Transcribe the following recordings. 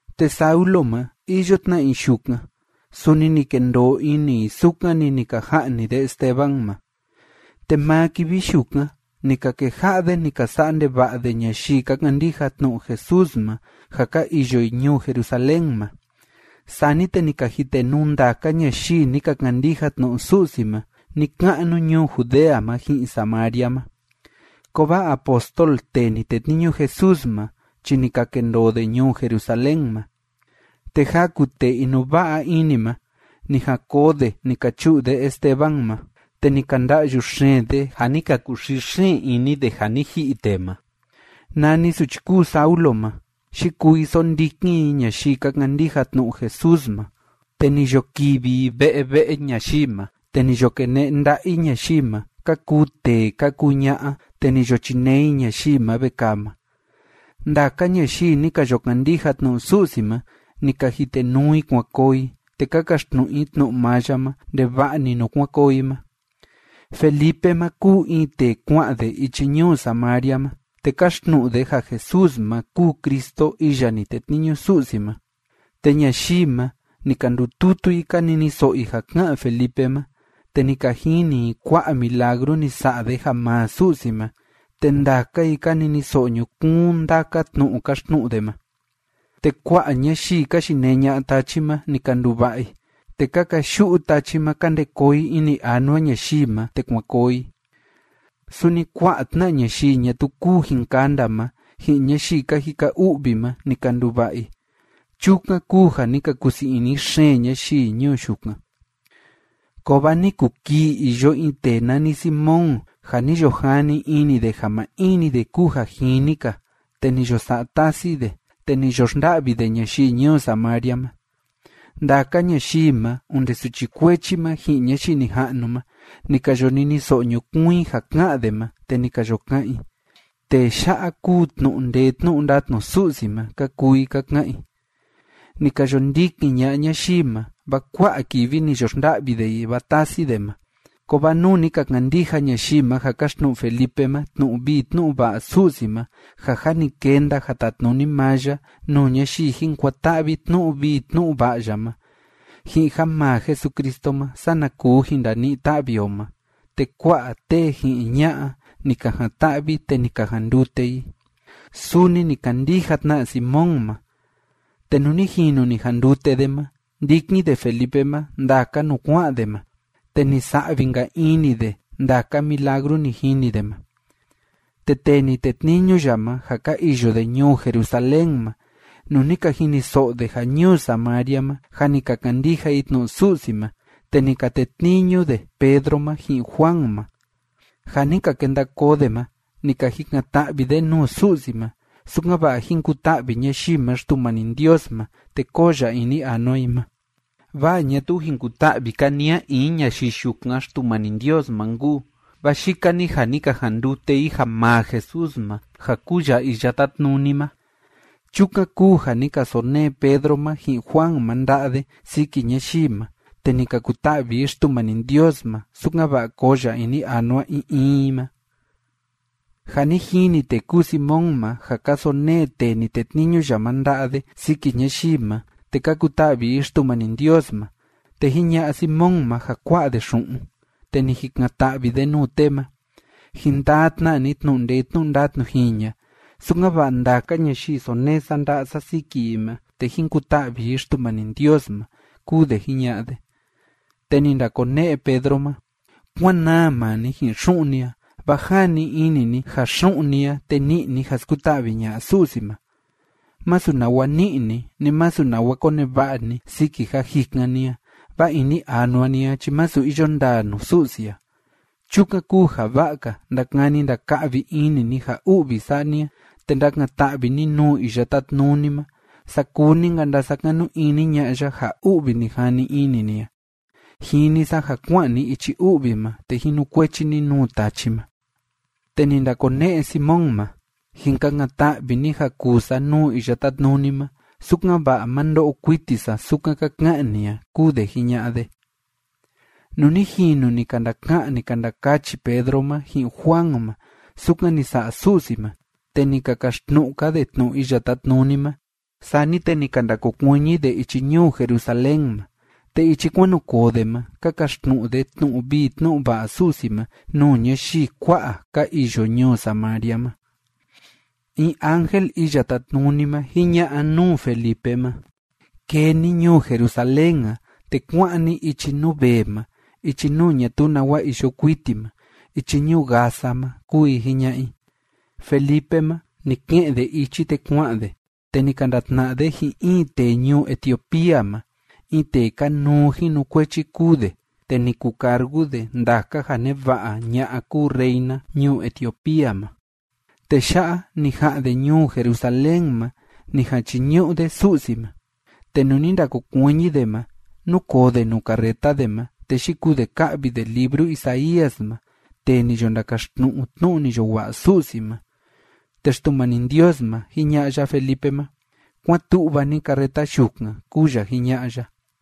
Te Saulo ma, iyo tna i yukan, suni ni kendoo ini i sukan‑ni ni ka ja'ni de Esteban ma. Suchi kúu Saulo ma, sondikin i ñayii ka kandija Jesús ma Te maa kivi yukan ni ka keja'a de ni ka sa'a ndeva'a de ñayii ka kandija tnu'u Jesús ma ja ka iyo i ñuu Jerusalén ma. Sani te ni ka jitenuu ndaka ñayii ni ka kandija tnu'u Su'si ma ni‑ka'nu ñuu Judea ma ji'in Samaria ma. Kovaa apóstol tee ni tetniñu Jesús ma chi ni ka kendoo de ñuu Jerusalén ma. Te jaku tee inuva'a ini ma, ni jan koo de ni ka chu'u de Esteban ma, te ni ka nda'yu xeen de, ja ni ka kuxii xeen ini de, ja ni ji'i tee ma. Nani suchi kúu Saulo ma, yikuu i sondikin i ñayii ka kandija tnu'u Jesús ma, te ni yo kivi i ve'e ve'e ñayii ma, te ni yo kene'e nda'a i ñayii ma, ka kuu tee ka kuu ña'a, te ni yo chinee i ñayii ma vekaa ma. Ndaka ñayii ni ka yo kandija tnu'u Su'si ma, ni ka jitenuu i kuan koo i, te ka kaxtnu'u i tnu'u maa ya ma ndeva'a‑ni nuu kuan koo i ma. Felipe ma kúu in tee kua'an de ichi ñuu Samaria ma, te káxtnu'u de ja Jesús ma kúu Cristo iya ni tetniñu Su'si ma. Te ñayii ma, ni ka ndututu i ka niniso'o i ja ká'an Felipe ma, te ni ka jini i kua'a milagru ni sa'a de ja maa Su'si ma, te ndaka i ka niniso'o ñukuun ndaka tnu'u káxtnu'u de ma. Te kua'a ñayii ka yinee ña'a tachi ma, ni ka nduva'a i, te ka kayu'u tachi ma ka nde koo i ini anua ñayii ma, te kuan koo i. Suni kua'a tna'a ñayii ñatuu kúu jin kanda ma, ji'in ñayii ka jika u'vi ma, ni ka nduva'a i. Chukan kúu ja ni ka kusii ini xeen ñayii ñuu yukan. Kovaa ni kuu kii iyo in tee nani Simón, ja ni yo jani ini de ja maa in‑ni de kúu ja jini‑ka, te ni yo sa'a tasi de, te ni yo xnda'vi de ñayii ñuu Samaria ma. Ndaka ñayii ma, onde suchi kuechi ma ji'in ñayii nija'nu ma, ni ka yo niniso'o ñukuun i ja ká'an de ma. Te ni ka yo ka'an i: ―¡Tee ya'a kúu tnu'u ndee tnu'u ndatnu Su'si ma! ―ka kuu i ka ka'an i. Ni ka yo ndikin ña'a ñayii ma, vaa kua'a kivi ni yo xnda'vi de i, vaa tasi de ma. Kovaa nuu ni ka kandija ñayii ma ja káxtnu'u Felipe ma tnu'u vii tnu'u va'a Su'si ma ja jâ ni kenda ja tatnuni maa ya nuu ñayii jin kuan‑ta'vi tnu'u vii tnu'u va'a ya ma, ji'in ja maa Jesucristo ma sana kuu jin ndani'i ta'vi o ma, te kua'a tee ji'in ña'a ni ka jan‑ta'vi te ni ka jandute i. Suni ni kandija tna Simón ma, te nuu ni jinu ni jandute de ma, ndikin de Felipe ma ndaka nuu kua'an de ma, te ni sa'vi‑nka ini de ndaka milagru ni jini de ma. Te tee ni tetniñu ya ma ja ka iyo de ñuu Jerusalén ma, nuu ni ka jiniso'o de ja ñuu Samaria ma jâ ni ka kandija i tnu'u Su'si ma, te ni ka tetniñu de Pedro ma ji'in Juan ma. Ja ni ka kenda koo de ma, ni ka jikan‑ta'vi de nuu Su'si ma, sukan‑va'a jín kuta'vi ñayii ma Xtumani Ndios ma, te kóo ya ini anua i ma. Vaa ñatuu jin kuta'vi‑ka ni a in ñayii yukan Xtumani Ndios ma nkuu, vaa yika‑ni ja ni ka jandute i ja maa Jesús ma ja kúu ya Iya Tátnuni ma. Chukan kúu ja ni ka sonee Pedro ma ji'in Juan ma nda'a de siki ñayii ma, te ni ka kuta'vi i Xtumani Ndios ma sukan‑va'a koo ya ini anua in in i ma. Ja ni jini tee kúu Simón ma ja ka sonee tee ni tetniñu ya ma nda'a de siki ñayii ma te ka kuta'vi i Xtumani Ndios ma, te jiña'a Simón ma ja kua'a de xu'un, te ni jikan‑ta'vi de nuu tee ma: ―Jin taa tna ni tnu'u ndee tnu'u ndatnu jiña, sukan‑va'a ndaka ñayii sonee sa nda'a sa siki i ma, te jín kuta'vi i Xtumani Ndios ma ―kúu de jiña'a de. Te ni ndakone'e Pedro ma: ―¡Kuán naa maa ni ji'in xu'un ni a, vaa jani ini ni ja xu'un ni a, te ni'i ni ja skuta'vi ña'a Su'si ma! Masu nawa ni'i ni, ni masu nawa koneva'a ni siki ja jikan ni a, vaa ini anua ni a chi masu iyo ndaa nuu Su'si a. Chukan kúu ja va'a‑ka ndakani ndaka'vi ini ni ja u'vi sa'a ni a, te ndakan‑ta'vi ni nuu Iya Tátnuni ma saa kuu‑ni‑nka ndasakanu ini ña'a ya ja u'vi ni jani ini ni a. Jini sa ja kua'an ni ichi u'vi ma, te jinukuechi ni nuu tachi ma. Te ni ndakone'e Simón ma: ―Jin kakan‑ta'vi ni ja kuu sa nuu Iya Tátnuni ma, sukan‑va'a ma ndo'o kuiti sa sukan ka ka'an ni a ―kúu de jiña'a de. Nuu ni jinu ni ka ndaka'an, ni ka ndakachi Pedro ma ji'in Juan ma sukan ni sa'a Su'si ma te ni ka kaxtnu'u‑ka de tnu'u Iya Tátnuni ma, sani te ni ka ndakokuiñi de ichi ñuu Jerusalén ma, te ichi kuan nu koo de ma ka kaxtnu'u de tnu'u vii tnu'u va'a Su'si ma nuu ñayii kua'a ka iyo ñuu Samaria ma. In ángel Iya Tátnuni ma jiña'a nuu Felipe ma: ―Kee ni ñuu Jerusalén a, te kuá'an ni ichi nuu vee ma, ichi nuu ñatuu nawa iyo kuiti ma, ichi ñuu Gaza ma ―kúu i jiña'a i. Felipe ma, ni ke'en de ichi, te kua'an de, te ni ka ndatna'a de ji'in in tee ñuu Etiopía ma. In tee kanuu jinukuechi kúu de. Te ni kucargu de ndaka ja neva'a ña'a kúu reina ñuu Etiopía ma. Tee ya'a, ni ja'an de ñuu Jerusalén ma ni jan chiñu'u de Su'si ma. Te nuu ni ndakokuiñi de ma, núkoo de nuu carreta de ma, te yikuu de ká'vi de libru Isaías ma tee ni yo ndakaxtnu'u tnu'u ni yo wa'a Su'si ma. Te Xtumani Ndios ma, jiña'a ya Felipe ma: ―Kuán tu'va ni carreta yukan ―kúu ya jiña'a ya.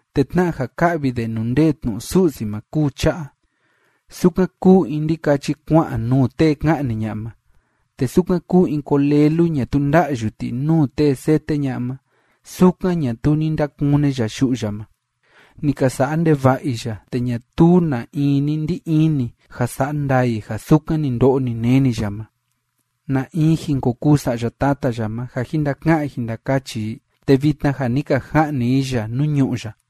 Te tna'a ja ká'vi de nuu ndee tnu'u Su'si ma kúu cha'a: Sukan kúu in ndikachi kua'an nuu tee ka'ni ña'a ma, te sukan kúu in kolelu ñatuu nda'yu ti nuu tee séte ña'a ma, sukan ñatuu ni ndakune ya yu'u ya ma. Ni ka sa'a ndeva'a i ya, te ñatuu na in ni ndi ini ja sa'a ndaa i ja sukan ni ndo'o ni neni ya ma. ¿Na in jin ko kuu sa'ya tata ya ma ja jin ndaka'an jin ndakachi i?, te vitna ja ni ka ja'ni i ya nuu ñu'ú ya.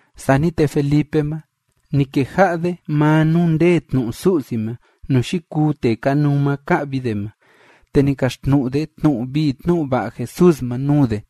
Sani te Felipe ma, ni keja'a de maa nuu ndee tnu'u Su'si ma nuu yikuu tee kanuu ma ká'vi de ma, te ni kaxtnu'u de tnu'u vii tnu'u va'a Jesús ma nuu de.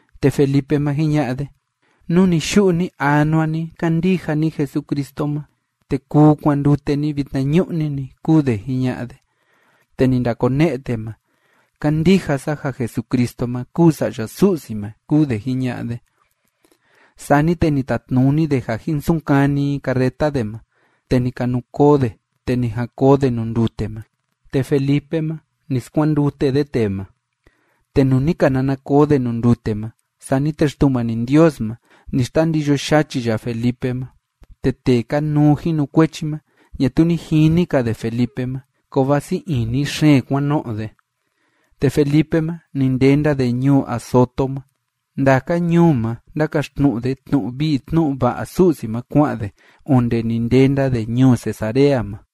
Te Felipe ma, jiña'a de: ―Nú ni‑yu'u ni‑anua ni kándija ni Jesucristo ma, te kuu kuandute ni vitnañu'ni‑ni ―kúu de jiña'a de. Te ni ndakone'e tee ma: ―Kándija sa ja Jesucristo ma kúu Sa'ya Su'si ma ―kúu de jiña'a de. Sani te ni tatnuni de ja jin sunkani i carreta de ma, te ni ka nu koo de, te ni jan koo de nuu ndute ma. Te Felipe ma, ni skuandute de tee ma. Te nuu ni ka nana koo de nuu ndute ma, sani te Xtumani Ndios ma, ni xtandiyo yachi ya Felipe ma. Te tee kanuu jinukuechi ma, ñatuu ni jini‑ka de Felipe ma, kovaa sii ini xeen kuan no'o de. Te Felipe ma, ni ndenda de ñuu Azoto ma. Ndaka ñuu ma ndákaxtnu'u de tnu'u vii tnu'u va'a Su'si ma, kua'an de onde ni ndenda de ñuu Cesarea ma.